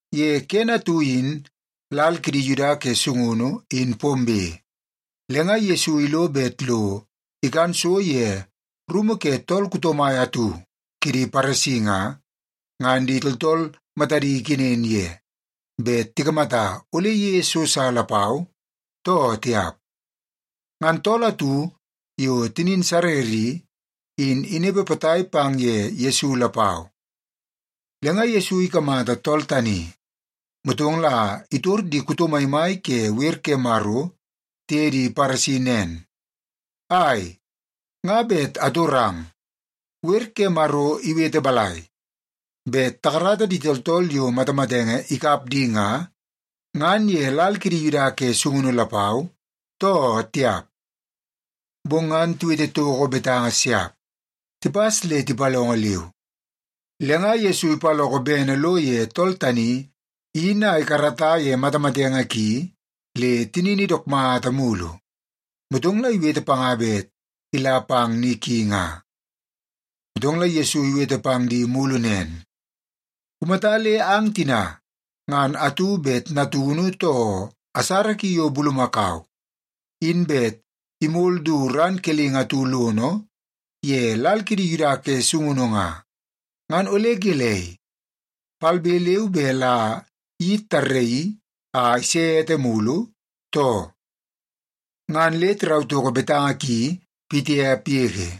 Ye kene atu in lal kidi Yuda ke sungunu in pombe, le nga Yesu ilo bet lo ikan so ye rumu ke tool kuto mai atu kidi Paresi nga, ngan di tooltool matadi ikenen ye bet tikamata ole iyeie so sa lapau, too tiap. Ngan tool atu yo tinin sarer i, in inepe potai pang ye Yesu lapau. Le nga Yesu ikamata tool tani, motong la itor di kuto maimai ke wer ke Maro tiye di Paresi nen, “Ai, nga bet atorang. Wer ke Maro iwete balai, bet takarata di tooltool yo matamatenge ikap di nga, ngan ye lal kidi Yuda ke sungunu lapau, too tiap?” Bong ngan tiwete toko betanga siap. Tipas le tipalongo leu. Le nga Yesu ipaloko bene lo ye tool tani in a ikarata ye matamatenge ki le tinini dook mata mulu, motong la iwete panga bet ila pang ni ki nga. Motong la Yesu iwete pang di mulu nen, “Kumata le ang tina ngan atu bet natunu, too asara ki yo bulumakau, in bet imol du ran kelingi atu lono ye lal kidi Yuda ke sungunu nga, ngan ole gelei, palbe leu be la kayit tarraii a ise ete mulu, too?” Ngan le tirau toko betanga ki pitiap yege.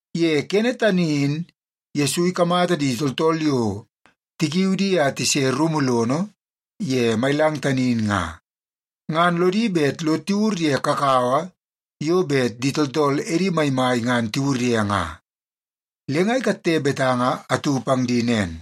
Ye kene tani in Yesu ikamata di tooltool yo tikiu di a tise rumu lono ye mailang tani in nga, ngan lodi bet lo tiwur ye kakawa yo bet di tooltool edi maimai ngan tiwur ye nga. Le nga ikatte betanga atu pang di nen,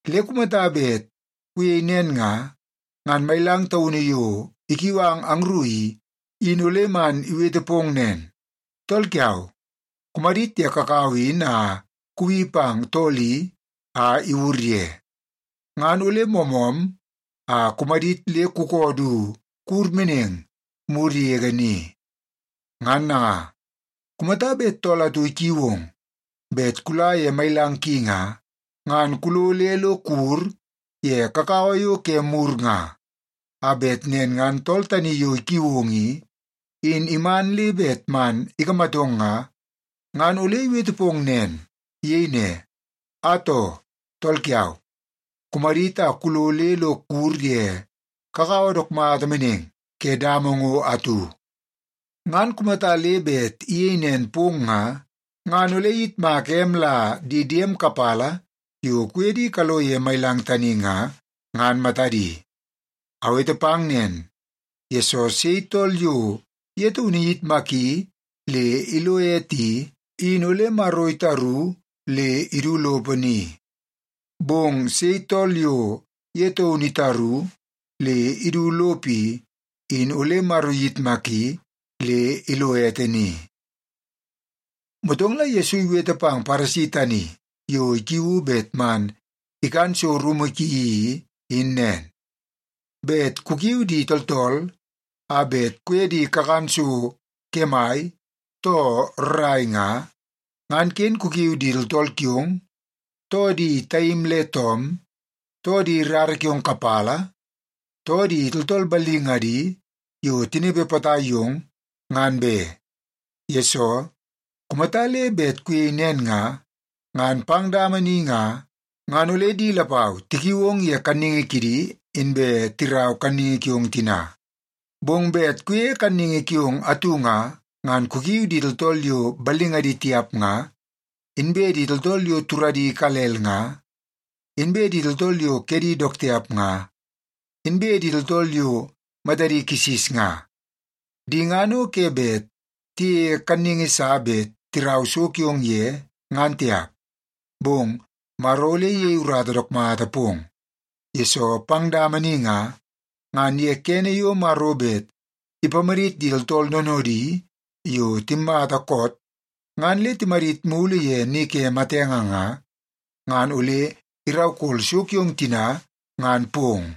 Le kumata bet kuyei nen nga, ngan mailang taunu yo ikiu ang angru i, in ole man iwete pong nen, ‘Tool kiau, kumadit ye kakawa in a kuwi pang tool i a iwur ye.’ Ngan ole moomoom a kumadit le kukoo du kuwur meneng mur yege ni. Ngan nanga, kumata bet tool atu ikiu ong bet kula ye mailang ki nga, ngan kulo le lo kuwur ye kakawa yo ke mur nga, a bet nen ngan tool tani yo ikiu ong i, in iman le bet man ikamatong nga, ngan ole iwete pong nen. Iyei ne, ‘Atoo, tool kiau, kumadit a kulo le lo kuwur ye kakawa dook mata meneng ke dama ngo atu.’ Ngan kumata le bet iyei nen pong nga, ngan ole iyitmaka em la di diem kapala yo kuye di kalo ye mailang tani nga, ngan matadi. Awete pang nen, yesoo sei tool yo ye taunu iyitmaki le ilo ete i, in ole Maro itaru le idu lopo ni. Bong sei tool yo ye taunu itaru le idu lopo i, in ole Maro iyitmaki le ilo ete ni.” Motong la Yesu iwete pang Paresi tani yo ikiuu bet man ikan so rumu ki i, in nen, “Bet kukiu di tooltool a bet kuye di kakan so kemai, too rrai nga, ngan ken kukiu di tooltool kiong, too di taim le toom, too di rara kiong kapala, too di tooltool ballingadi yo tinepe potai yong, ngan be. Yesoo, kumata le bet kuyei nen nga, ngan pang dama ni nga, ngan ole di lapau tikiui ong ye kanningi kidi, inbe tirau kanningi kiong tina. Bong bet kuyeie kanningi kiong atu nga, ngan kukiu di tooltool yo ballingadi tiap nga, inbe di tooltool yo turadi ikalel nga, inbe di tooltool yo kedi dook tiap nga, inbe di tooltool yo matadi kisis nga. Di ngan o ke bet tiyeie kanningi sa bet tirau so kiong ye, ngan tiap. Bong Maro ole iyei urata dook mata pong, yesoo pang dama ni nga, ngan ye kene yo Maro bet ipamadit di tooltool noonoodi yo timmata koot ngan le timadit mulu ye ni ke matenge nga, ngan ole iraukol so kiong tina ngan pong.”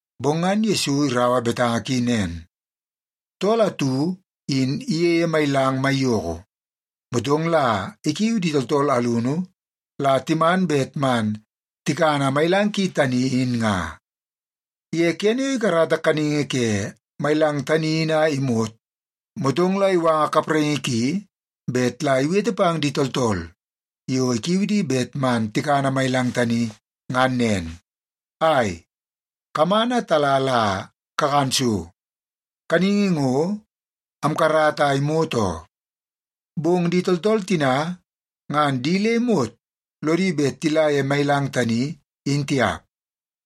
Bong ngan Yesu iraua betanga ki nen, “Tool atu in iyeie mailang maiyoko, motong la ikiu di tooltool alunu la timan bet man tikana mailang ki tani in nga. Ye kene yo ikarata kaningi ke mailang tani in a imot, motong la iwanga kapraingi ki bet la iwete pang di tooltool yo ikiu di bet man tikana mailang tani ngan nen, ‘Ai, kaman a tala la kakan so. Kaningi ngo, amkarata a imot oo.’ “Bong di tooltool tina ngan di le imot lodi bet tila ye mailang tani in tiap,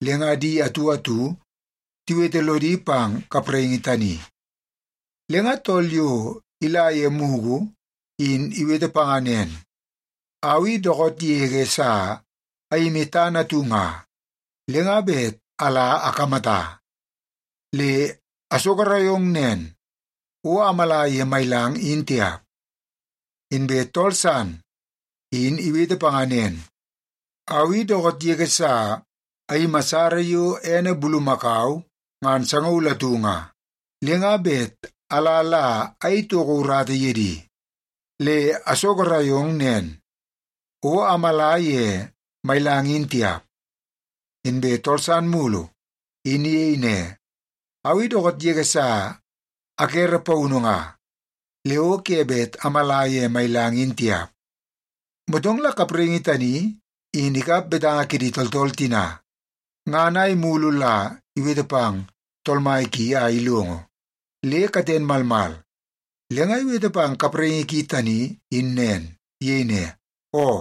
le nga di atu atu tiwete lodi pang kapraingi tani. Le nga tool yo ila ye mugu in iwete panga nen, ‘Au i dookoot yege sa ayimi tana atu nga, le nga bet ala akamata. Le asogorai ong nen, o amala ye mailang in tiap.’ “Inbe tool san in iwete panga nen, ‘Au i dookoot yege sa ayimi asara yo ene bulumakau ngan sangaul atu nga, le nga bet ala la ayei toko urata ye di. Le asogorai ong nen, o amala ye mailang in tiap.’ “Inbe tool san mulu in iyei ne, ‘Au i dookoot yege sa akere paunu nga, le o ke bet amala ye mailang in tiap.’ “Motong la kapraingi tani in ikap betanga kidi tooltool tina, ngan a imulu la iwete pang tool mai ki a ilongo, le katen malmal, le nga iwete pang kapraingi ki tani in nen. Iyei ne, ‘Oo,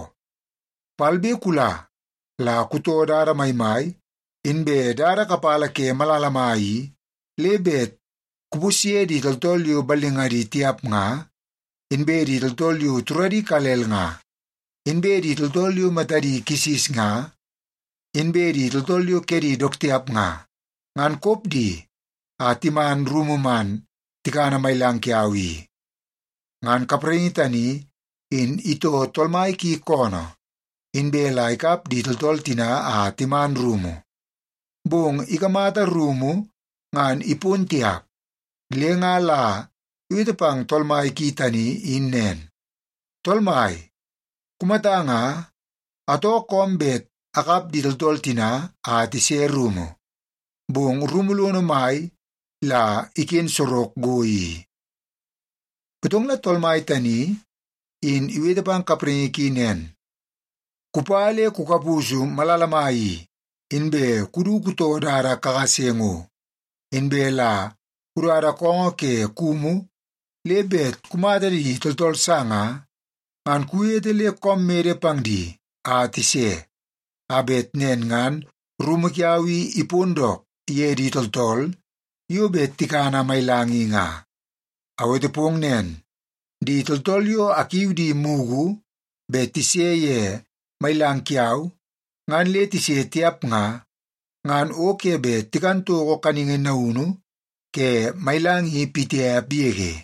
palbe kula la kutoo dada maimai inbe dada kapala ke malala mai i, le bet kupusye di tooltool yo ballingadi tiap nga, inbe di tooltool yo turadi ikalel nga, inbe di tooltool yo matadi kisis nga, inbe di tooltool yo kedi dook tiap nga, ngan kop di a timan rumu man tikana mailang kiau i.’ “Ngan kapraingi tani in itoo tool mai ki koonoo, inbe la ikap di tooltool tina a timan rumu. Bong ikamata rumu ngan ipon tiap, le nga la iwete pang tool mai ki tani in nen, ‘Tool mai, kumata nga, atoo koom bet akap di tooltool tina a tise rumu, bong rumu lono mai la iken sorok go i.’ “Motong la tool mai tani in iwete pang kapraingi ki nen, ‘Kupa le kukapusu malala mai i, inbe kudu kutoo dada kakase ngo, inbe la kudada koongoo ke kumu le bet kumata di tooltool sa nga, ngan kuwete le koom mede pang di a tise, a bet nen ngan rumu kiau i ipon dook ye di tooltool yo bet tikana mailang i nga. Awete pong nen, di tooltool yo akiu di mugu bet tise ye mailang kiau ngan le tise tiap nga, ngan o ke bet tikan toko kaningi naunu ke mailang i pitiap yege.’”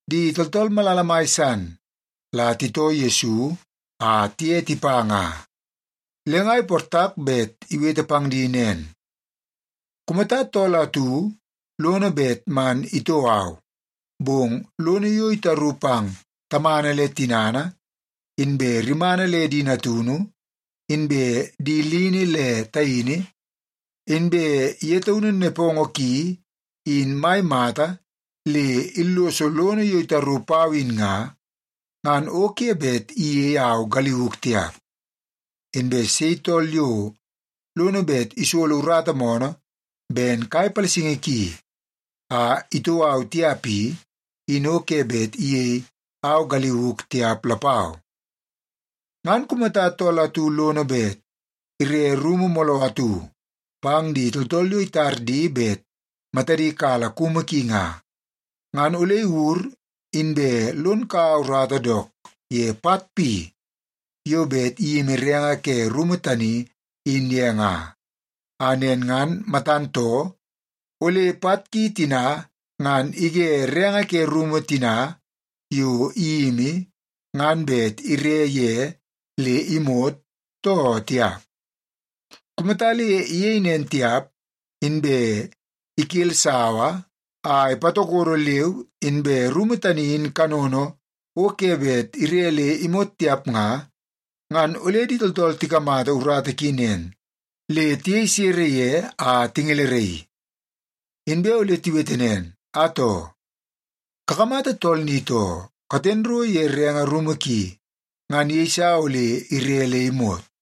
Di tooltool malala mai san la titoo Yesu a tiye tipa nga. Le nga iportak bet iwete pang di nen, “Kumata tool atu lono bet man itoo au, bong lono yo itaru pang tamana le tinana, inbe rimana le di natunu, inbe di lini le taini, inbe ye taunu nepongo ki in mai mata le illoso lono yo itaru pau in nga, ngan o ke bet iyei au galiuk tiap. Inbe sei tool yo lono bet isolo urata moonoo ben kai palasingi ki, a itoo au tiap i, in o ke bet iyei au galiuk tiap lapau. “Ngan kumata tool atu lono bet ire rumu mooloo atu pang di tooltool yo itar di bet matadi kala kumu ki nga, ngan ole iwur inbe lon kaua urata dook ye pat pi yo bet iyimi renge ke rumu tani in ye nga. A nen ngan matan too, ole pat ki tina ngan ige renge ke rumu tina yo iyimi ngan bet ire ye le imot, too tiap. Kumata le iyei nen tiap, inbe ikel sawa a ipatokodo leu, inbe rumu tani in kanono o ke bet ire le imot tiap nga, ngan ole di tooltool tikamata urata ki nen, le tiyei sere ye a tingeleraii. Inbe ole tiwete nen, ‘Atoo, kakamata tool ni too, katen ro ye renge rumu ki ngan iyeisa ole ire le imot.’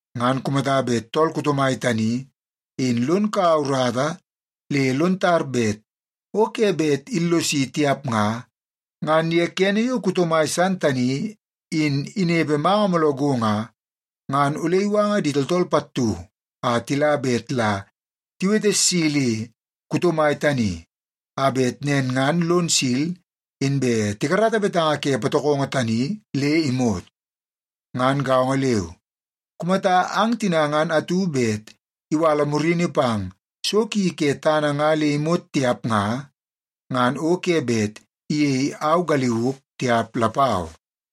Ngan kumata bet tool kuto mai tani in lon kaua urata le lon tar bet o ke bet illosi tiap nga, ngan ye kene yo kuto mai san tani in inepe manga mooloo go nga, ngan ole iwanga di tooltool pattu a tila bet la tiwete silli kuto mai tani, a bet nen ngan lon sil inbe tikarata betanga ke patokongo tani le imot. Ngan gaongo leu, kumata ang tina ngan atu bet iwala murini pang so ki ke tana nga le imot tiap nga, ngan o ke bet iyei au galiuk tiap lapau.”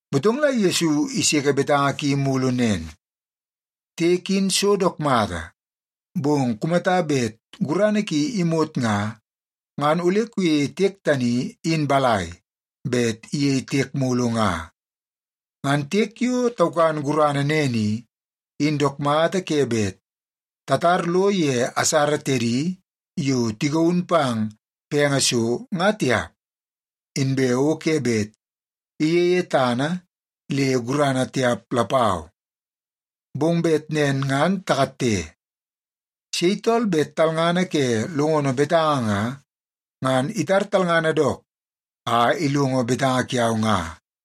Motong la Yesu iseke betanga ki mulu nen, “Tiek in so dook mata, bong kumata bet gurana ki imot nga, ngan ole kuyeie tiek tani in balai bet iyei tiek mulu nga? Ngan tiek yo taukan gurana nen i, in dook mata ke bet tatar lo ye asara tedi yo tigaun pang penge so, nga tiap, inbe o ke bet iyeie tana le gurana tiap lapau. Bong bet nen ngan takatte. Sei tool bet talngana ke longono betanga nga, ngan itar talngana dook a ilongo betanga kiau nga.”